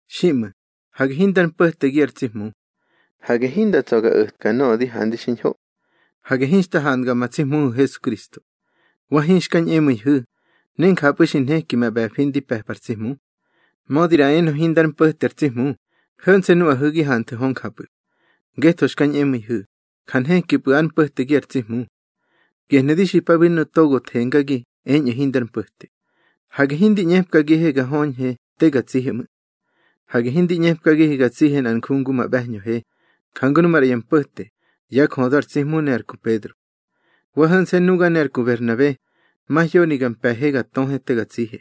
Xiꞌmu̱, hage hindar mpo̱tegi ar tsi Hmu. Hage hinda tsa̱ ga o̱tka nöꞌö di handi xiñho. Hage hinxta handga ma tsi Hmuhu̱ Hesukristo. Wa hinxka ñꞌemu̱ihu̱, ne njapꞌu̱ xi nheki ma ꞌbe̱fi ndi pe̱pa ar tsi Hmu. Mödi ꞌra enö hindar mpo̱te ar tsi Hmu, ho̱nse̱ nuꞌahu̱ gi hanthu̱ hö njapꞌu̱. Ngetho xka ñꞌemu̱ihu̱, ja nhekipꞌu̱ ár mpo̱tegi ar tsi Hmu. Gehnu̱ di xipabi nuꞌu̱ togo thengagi eñꞌu̱ hindar mpo̱te: Hage hindi ꞌñepkagihe ga höñhe te ga tsihe ꞌmu̱. Hage hindi ꞌñepkagihe ga tsihe nꞌar nju ngu ma ꞌbe̱hñöhe, jangu nu maꞌra ya mpo̱te, yá jödö ar tsi Hmu ne ar ku Pedro. Wa ho̱nse̱ nuga ne ar ku Berhnabe, mahyoni ga mpe̱he ga töhe te ga tsihe.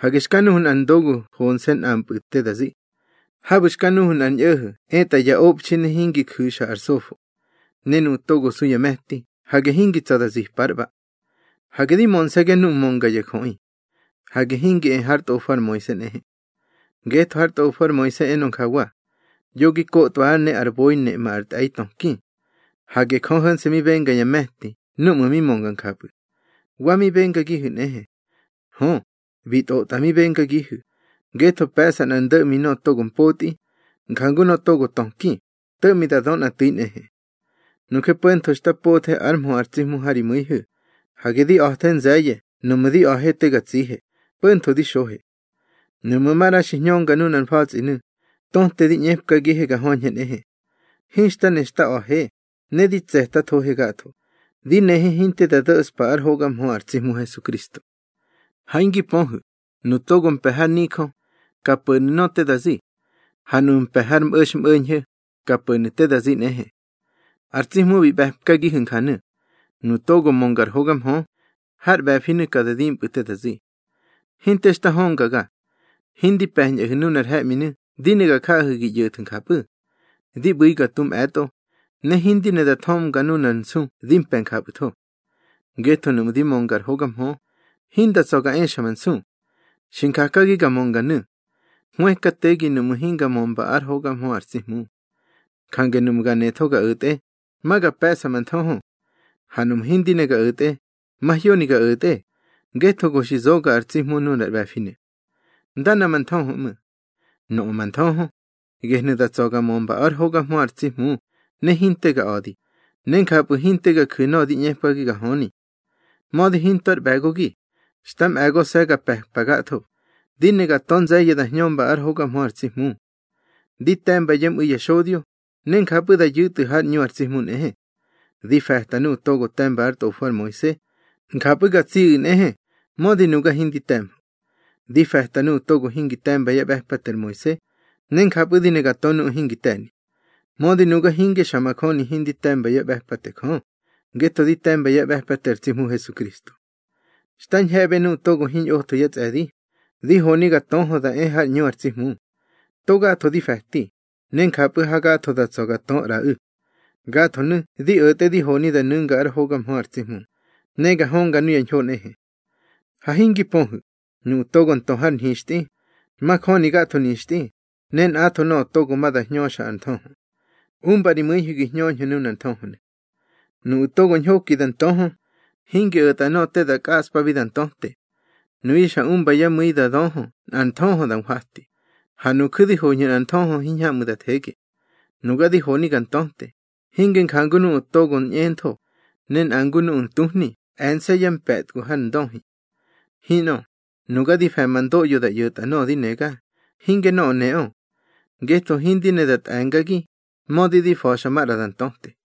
Hage xka nuhu̱ nꞌar ndogu honse̱ nꞌampꞌu̱ te da zi. Habu̱ xka nuhu̱ nꞌar ñꞌo̱ho̱ etꞌa ya obxi ne hingi ju̱xa ar sofo. Ne nuꞌu̱ togo su ya me̱ti, hage hingi tsa̱ da zipa ár ꞌba. Hage di mönse̱ga ngu mönga ya jöꞌi. Hage hingi e hár tꞌofo ar Moise nꞌehe. Ngetho hár tꞌofo ar Moise enö njawa: Yo gi kotwa ár ne ar boi neꞌma ar tꞌe̱i töki. Hage Jö ho̱nse̱ mi benga ya me̱ti núꞌmu̱ mi mönga njapꞌu̱. Wa mi bengagihu̱ nꞌehe. Hö, bi tꞌotꞌa mi bengagihu̱; ngetho pe̱ꞌsa nꞌar ndo̱ꞌmi nöꞌö togo mpotꞌi, jangu nöꞌö togo töki, to̱ꞌmi da dö nꞌa tu̱i nꞌehe. Nuje po̱ntho xta pothe ár mhö ar tsi Hmu ha ri mu̱ihu̱, hage di a̱the nze̱ye̱ nuꞌmu̱ di a̱he te ga tsihe, po̱ntho di xohe. Nuꞌmu̱ maꞌra xi hñönga nunar mfa̱tsꞌinu̱, töte di ꞌñepkagihe ga höñhe nꞌehe. Hinxta ne xta a̱he, ne di tse̱tathohe gatho, di nehe hinte da do̱ꞌspa ár hoga mhö ar tsi Hmu Hesukristo. Ha hingi pöhu̱, nuꞌu̱ togo mpe̱ har nijö, ka po̱nu̱ nöꞌö te da zi. Ha nuꞌu̱ mpe̱ har mꞌo̱xmꞌo̱ñho̱, ka po̱nu̱ te da zi nꞌehe. Ar tsi Hmu bi ꞌbe̱pkagihu̱ njanu: Nuꞌu̱ togo mönga ar hoga mhö, har ꞌbe̱finu̱ ka da dimpꞌu̱ te da zi. Hinte xta höngaga. Hindi pe̱ñꞌahu̱ nunar he̱ꞌminu̱ di ne ga jaꞌahu̱ gi ꞌyo̱thu̱ njapꞌu̱. Di ꞌbu̱i ga tu mꞌe̱tꞌo, ne hindi ne da thömga nunar nsu di mpe̱ njapꞌu̱tho. Ngetho nuꞌmu̱ di mönga ar hoga mhö, hinda tsa̱ ga exa ma nsu. Xi njakagi ga mönganu̱. Hwëkategi nuꞌmu̱ hinga mömba ár hoga mhö ar tsi Hmu. Jange nuꞌmu̱ ga netho ga o̱tꞌe, ma ga pe̱ꞌsa ma nthöhö. Ha nuꞌmu̱ hindi ne ga o̱tꞌe, mahyoni ga o̱tꞌe, ngetho go xi zoga ar tsi Hmu nunar ꞌbe̱finu̱. Ndana ma nthöhö ꞌmu̱. Nöꞌö ma nthöhö, gehnu̱ da tsa̱ ga mömba ár hoga mhö ar tsi Hmu ne hinte ga a̱di, ne njapꞌu̱ hinte ga ju̱ nöꞌö di ꞌñepkagi ga höni. Mödi hinto ár ꞌbe̱gogi, xta mꞌe̱gose̱ ga pe̱pa gatho, di ne ga tö nze̱ye̱ da hñömba ár hoga mhö ar tsi Hmu. Di te̱mba yá mꞌu̱i ya xodyo, ne njapꞌu̱ da yu̱tꞌu̱ hár ꞌñu ar tsi Hmu nꞌehe. Di fe̱ta nuꞌu̱ togo te̱mba ár tꞌofo ar Moise, njapꞌu̱ ga tsiꞌu̱ nꞌehe, mödi nuga hindi te̱mhö. Di fe̱ta nuꞌu̱ togo hingi te̱mba yá ꞌbe̱pate ar Moise, ne njapꞌu̱ di ne ga tö nuꞌu̱ hingi te̱ni. Mödi nuga hinge xa majöni hindi te̱mba yá ꞌbe̱pate Jö, ngetho di te̱mba yá ꞌbe̱pate ar tsi Hmu Hesukristo. Xta ñhe̱ꞌbe nuꞌu̱ togo hiñꞌotho yá tsꞌe̱di, di honi ga töhö da e hár ꞌñu ar tsi Hmu. To gatho di fe̱ti, ne njapꞌu̱ hagatho da tsa̱ ga tö ꞌraꞌu̱. Gathonu̱ di o̱tꞌe di honi da nu̱nga ár hoga mhö ar tsi Hmu, ne ga hönga nuya ñho nꞌehe. Ha hingi pöhu̱, nuꞌu̱ togo ntö har nhixtꞌi, majöni gatho nixtꞌi, ne nꞌatho nöꞌö togo ma da hñöxa ar nthöhö. Umba ri mu̱ihu̱ gi hñöñhu̱ nunar nthöhönu̱. Nuꞌu̱ togo ñhoki da ntöhö, hingi o̱tꞌa nöꞌö te da kꞌaꞌspabi da ntöte. Nuyu̱ xa umba yá mu̱i da dö nꞌar nthöhö da nhwati, ha nuju̱ di hoñhu̱ nꞌar nthöhö hiñhamꞌu̱ da thege. Nuga di honi ga ntöte, hinge njangu nuꞌu̱ togo ñꞌentho, ne nꞌa ngu nuꞌu̱ ntuhni, e̱nse̱ ya mpe̱tgu har ndöhi. Hinꞌö, nuga di fe̱ ma ndoꞌyo da ꞌyo̱tꞌa nöꞌö di nega, hinge nöꞌö neꞌö. Ngetho hindi ne da tꞌe̱ngagi, mödi di fa̱xa maꞌra da ntöte.